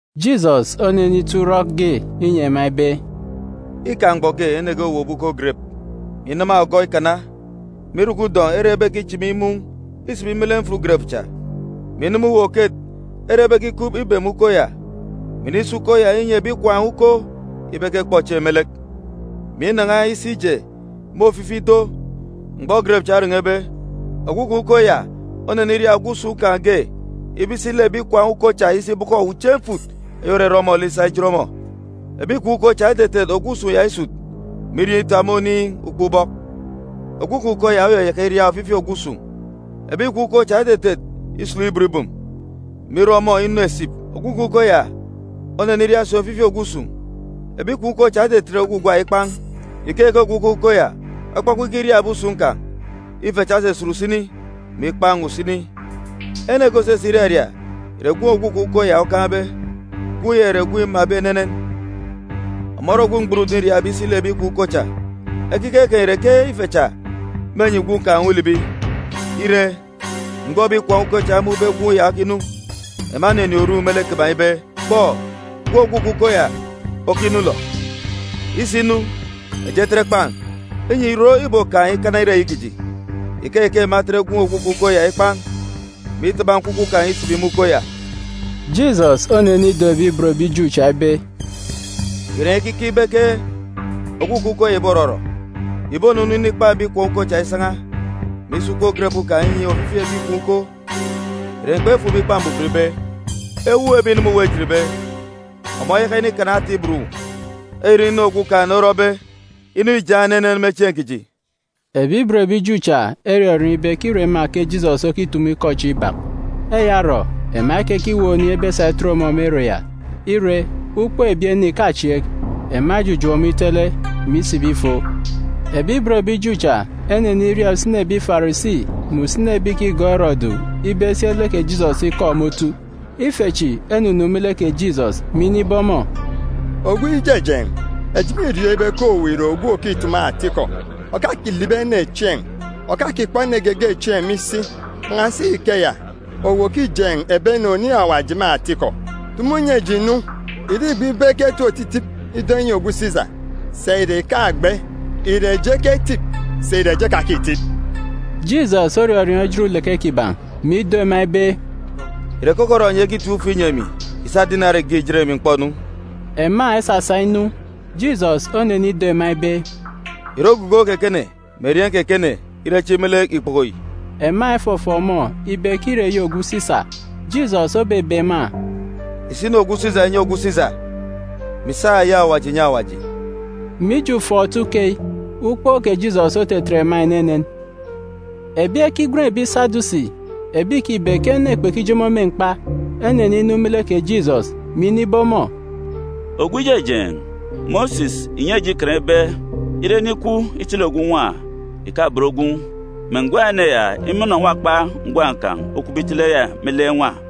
Jisọs onenito urọk ge inyi ema ibe, “Îkaan̄ ene ge òwowop uko gerep, mè inama ogọ ikana, mè irọkọ udọn̄ ere ebekichimi mun̄ isibi me lek mfut gerep cha, mè inama uwu-oket ere ebekinene isi ikup ikibem uko ya, mè inisa uko ya inyi ebi ikwaan̄ uko ibe ekekpọ chieen̄ me lek, mè inan̄a isi ije me ofifi ido. Mgbọ gerep cha oren̄ebe, ogwukaan̄ uko ya oneniria ogwu usun̄ kan̄ ge ibe isi lek ebi ikwaan̄ uko cha isi ibọkọ uche mfut eyi òrere ọmọ lek isa ijet ọmọ. Ebi ikwaan̄ uko cha etetet ogwu usun̄ ya isut, mè irieen̄ itap me oniin̄, ukpọk ubọk. Ogwukaan̄ uko ya oyayaka iria ofifi ogwu usun̄. Ebi ikwaan̄ uko cha etetet isulu ibot ibum, mè irọ ọmọ inu esip. Ogwukaan̄ uko ya oneniria si ofifi ogwu usun̄. Ebi ikwaan̄ uko cha etetet ogwugwa ikpan̄. Ikeyi ke ogwukaan̄ uko ya okpọkpọ ikiria ebi usun̄ kan̄. Ife cha esusut usini, mè ikpan̄ usini. “Ene ge òsisik iraria ìre gwun̄ ogwukaan̄ uko ya okaan̄be. Gwun̄ ya ìre gwun̄ îmabe enenen. Ọmọ ore ogwu mgburudun̄ îriabe isi lek ebi ikwaan̄ uko cha. Ekiket kan̄ ìre ke ife cha mênyi gwun̄ kan̄ ulibi. “Ire, mgbọ ebi ikwaan̄ uko cha emun̄be gwun̄ ya okinu, ema eninin̄ oru me lek kiban̄ ibe, ‘Kpọ gwun̄ ogwukaan̄ uko ya okinu yilọ! Isinu, eji etet ekpan̄, inyi ìrot ìbokaan̄ ikana ire eyi kiji.’ Ikeyi ke ema etet gwun̄ ogwukaan̄ uko ya ikpan̄, mè itaba nkwukwu kan̄ isibi me uko ya.” Jisọs onenido ebi ibot ebi Ju cha ibe, “Ìre enyi ekeek ibe ke ogwukaan̄ uko ya ìborọrọ? Ìbonunu inikpan̄ ebi ikwaan̄ uko cha isan̄a, mè isa uko gerep kan̄ ya inyi ofifi ebi ikwaan̄ uko. Ìre enyi kpefuk me Ikpa Mbuban ibe, “ ‘Ewuuk ebi ìnama uwu ejitbe, ọmọ oyaka inikana ata ibot uwu. Eyi ìre inu Okumugwem orọbe, inu yi îjaan̄ enenen me chieen̄ kiji’a?” Ebi ibot ebi Ju cha erọriọọn̄ ibe ke îre ema ke Jisọs okitumu ikọ chi ibak. Eya orọ ema ekekiweek oniin̄ ebesa itet ọmọ me ere ya. Ire, ukpook ebi ene ìkachieek. Ema ejujuuk ọmọ itele, mè isibi ifon. Ebi ibot ebi Ju cha eneniria usini ebi Farisi mè usini ebi ìkigọọk Erọdu ibe esi eleke Jisọs ikọ me otu. Ife chi enunu me lek kè Jisọs, mè inibe ọmọ, “Ogwu Ijejeen̄, eji mîriọọn̄ ibe ke owu ìre ogwu òkitumu atikọ, òkakilibi ene chieen̄, òkakikpọ ene geege chieen̄ me isi. Kpan̄asi ikeya, owu òkijeen̄ ebi ene oniin̄ Awaji me atikọ. Tumu nyi eji nu, ìre îgbe ibe eketip otitip ido enyi ogwu Sisa, sà ìre ìkagbe? Ìre eji eketip, sà ìre eji ekakitip?” Jisọs orọriọọn̄ ejit uleke kiban̄, mè ido ema ibe, “Ìre keke orọ enyi ekitip ufe inyi emi? Ìsa dinari ge ìjet emi m̀kpọ-nu.” Ema esasa inu. Jisọs onenido ema ibe, “Ìre ogugo kè ekene mè erieen̄ kè ekene ire echi me lek ikpoko yi?” Ema efọfọọk ọmọ ibe ke îre eyi ogwu Sisa. Jisọs obebe ema, “Ìsa inu ogwu Sisa ìnyi ogwu Sisa, mè ìsa eyi Awaji ìnyi Awaji.” Mije ufọọk-otu keyi, ukpook kè Jisọs otetet ema enenen. Ebi Sadusi, ebi ìkibe ke ene kpekijomo me mkpa, eneninu me lek kè Jisọs, mè inibe ọmọ, “Ogwu Ijejeen̄, Mosis ìnyi eji Ikan ibe, ire ene ikwu itele ogwu nwa, ìkabon gwun̄, mè ngwan̄ ene ya imọnọ nwakpa ngwan̄ kan̄ okwube itele ya me lek nwa,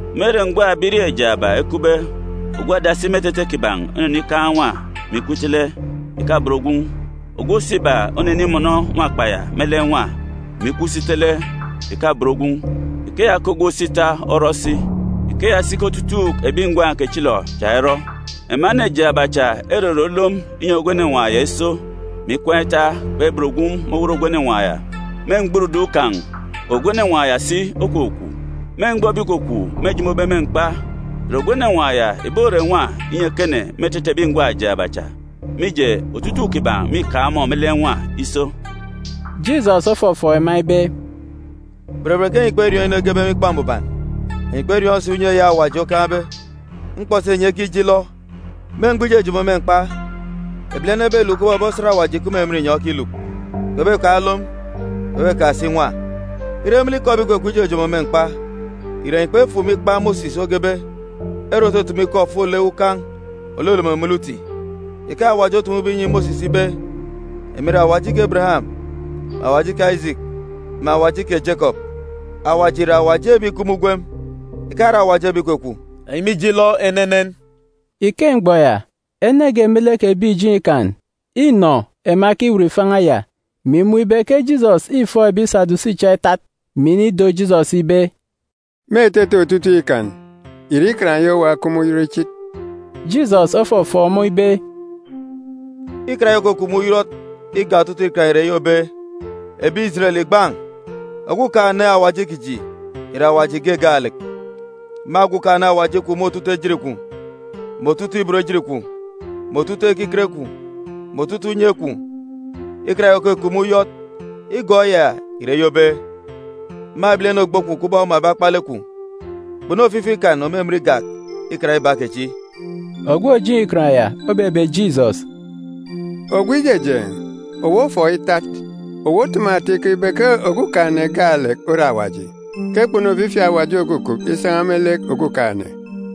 Me ere ngwan̄ ebirieen̄ jaaba ekupbe, ogwu adasi me etete kiban̄ onenido nwa, mè ikwu itele, ìkabon gwun̄. Ogwu òso iba onenimọnọ nwakpa ya me lek nwa, mè ikwu si itele, ìkabon gwun̄. Ikeya ke ogwu òso ita orọ si. Ikeya si ke otutuuk ebi ngwan̄ kechilọ cha erọ. Ema ene jaaba cha erere olom inyi ogwu enenwaan̄ ya iso, mè ikwaan̄ ita, kpebon gwun̄ me owot ogwu enenwaan̄ ya. Me mgburudun̄ kan̄, ogwu enenwaan̄ ya si okwukwu. Me mgbọ ebi ìkwakwaan̄ mêjomobe me mkpa, ìre ogwu enenwaan̄ yi ìbore nwa inyi ekene me etete ebi ngwan̄ jaaba cha, mije, otutuuk kiban̄ mîkaan̄ ọmọ me lek nwa iso?” Jisọs ofọfọọk ema ibe, “Berebet ke enyi kperiọọn̄ inu egebe me Ikpa Mbuban, enyi kperiọọn̄ si unye Awaji okaan̄be. Mkpọ si enyi ekije ilọ! Me mgbọ ijojomo me mkpa, ebilene ebeluk kubọk ebi osat Awaji ìkup me emen inyọn̄ ekiluk. Kpebekaan̄ olom, kpebekaan̄ si nwa. Ire me lek ikọ ebi ìkwakwaan̄ ijojomo me mkpa, ìre enyi kpefuk me ikpa kè Mosis, ere òtutumu ikọ ofolek ukan̄ òlolomo me lek uti, ike Awaji otumube inyi Mosis ibe, ‘Emi ìre Awaji kè Ebereyam, mè Awaji kè Ajiki, mè Awaji kè Jekọp’c? Awaji ìre Awaji ebi ìkup me ugwem, ìkare Awaji ebi ìkwakwaan̄. Enyi mîje ilọ enenen!” Ike mgbọ ya, ene ge me lek ebi ìjeen̄ Ikan înọ ema ekiwut ifan̄a ya, mè imun̄ ibe ke Jisọs îfọọk ebi Sadusi cha itat, mè inido Jisọs ibe, “Me etete otutuuk Ikan, ìre Ikan eyi owa okup me uyọt ichit?” Jisọs ofọfọọk ọmọ ibe, “Ikan eyi òkukup me uyọt igak otutuuk Ikan ìre eyi òbe, “ ‘Ebi Ijeren, ìgban̄! Okumugwem Awaji kiji, ìre Awaji ge gaalek. Ma Okumugwem Awaji kwun̄ me otutuuk ejit kwun̄, mè otutuuk ibot ejit kwun̄, mè otutuuk ekiket kwun̄, Ikan eyi òkup me uyọt igọọk eya ìre eyi òbe, “ ‘Ma ogwu ebilene ogbo kwun̄ kubọk omabe akpalek kwun̄.’e Kpunu ofifi Ikan òmimin igak Ikan iba kechi.” Ogwu òjeen̄ Ikan ya obebe Jisọs, “Ogwu Ijejeen̄, owu ofọọk itat. Owu otumu atikọ ibe ke Okumugwem gaalek ore Awaji; ke kpunu ofifi Awaji òkukup isan̄a me lek Okumugwem;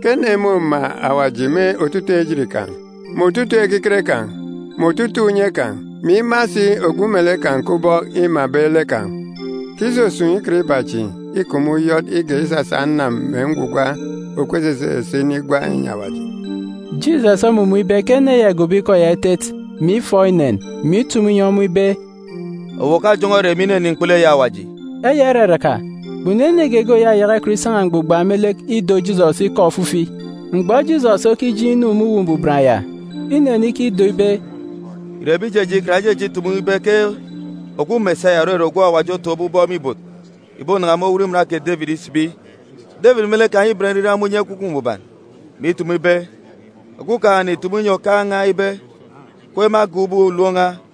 ke ene môma Awaji me otutuuk ejit kan̄, mè otutuuk ekiket kan̄, mè otutuuk unye kan̄, mè ima si ogwu melek kan̄ kubọk îmabe lek kan̄; ke isusun̄ Ikan iba chi îkup me uyọt igak isasa anam mè ngwugwa òkup esese esese inigwa inyi Awaji.” Jisọs omumun̄ ibe ke ene ya îgobo ikọ ya itet, mè ifọọk inen, mè initumu inyi ọmọ ibe, “Owu òkajọn̄ọ ere me ininin̄ mkpulu eyi Awaji.” Eya iraraka, kpunu ene geege òyayaka ikọt isan̄a mgbugba me lek ido Jisọs ikọ ofifi. Mgbọ Jisọs okijeen̄ inu me Uwu Mbuban ya, inenikido ibe, “Ìre ebi ìjeen̄ Ikan ejeje ikitumu ibe ke ogwu Mesaya (òrere ogwu Awaji otọkọbe aran̄ me ibot) ìbonan̄a me owot iman kè Debit isibi? Debit me lek kan̄ îben nriran me unye Ekwukwu Mbuban, mè itumu ibe, “ ‘Okumugwem ìtumu inyi Okaan̄ n̄a ibe, “Siki kweek irek me agan̄ ubọk ulom n̄a,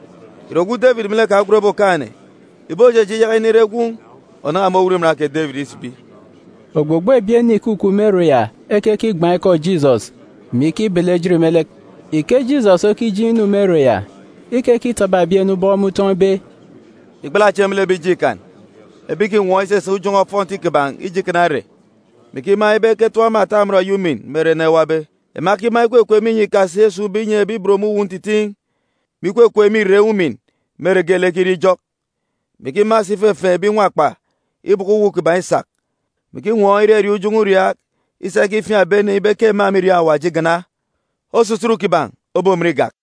Ìre ogwu Debit me lek kan̄ ogwenbe Okaan̄-ene ìbojeje iyaka inire gwun̄ ònan̄a me owot iman kè Debit isibi?” Ogbogbo ebi ene ìkukup me ere ya ekekigban̄ ikọ kè Jisọs, mè ikibele ejit me lek. Ike Jisọs okijeen̄ inu me ere ya, ikekitaba ebi ene ubọk me utọn̄ ibe, “Ìgbala chieen̄ me lek ebi ìjeen̄ Ikan, ebi ìkinwọọn̄ itatap ujọn̄ọ ofọnti mgbọ geelek, mè ikima ibe eketọp ema ata amọn eyi umin me ere ene ewabe. Ema ekima ikwekweek me inyọn̄ ikasi esun̄be inyi ebi ibot me uwu ntitiin̄, mè ikwekweek me irek umin me ere geelek ekirie ijọk, mè ikima si ifefeen̄ ebi nwakpa ibọkọ uwu kiban̄ isak, mè ikinwọọn̄ irariaak ujọn̄ọ uriaak isa ikifiaan̄ ebi ene ibe ke ema mîriọọn̄ Awaji igana. Osusut kiban̄ obomin igak.”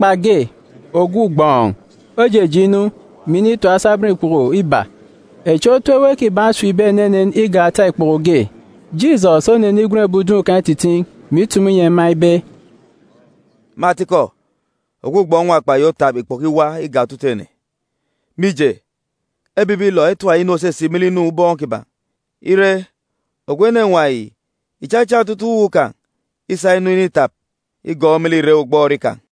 Nwakpa ge, ogwu ugbọọn̄, ojeje inu, mè initap asabọn ikpoko ekwe iba (echi otu ewe kiban̄ osipbe enenen igak ata ikpoko ge). Jisọs onenigwen ebi udun̄ kan̄ ititiin̄, mè itumu inyi ema ibe, “Me atikọ, ogwu ugbọọn̄ nwakpa yi otap ikpoko iwa igak otutuuk ene. Mije, ebibilọ etap inu òsisik me lek inu ubọọn̄ kiban̄. Ire, ogwu nwakpa yi ìchachan otutuuk uwu kan̄ isa inu initap, igọọk me lek irek ugbọọri kan̄.”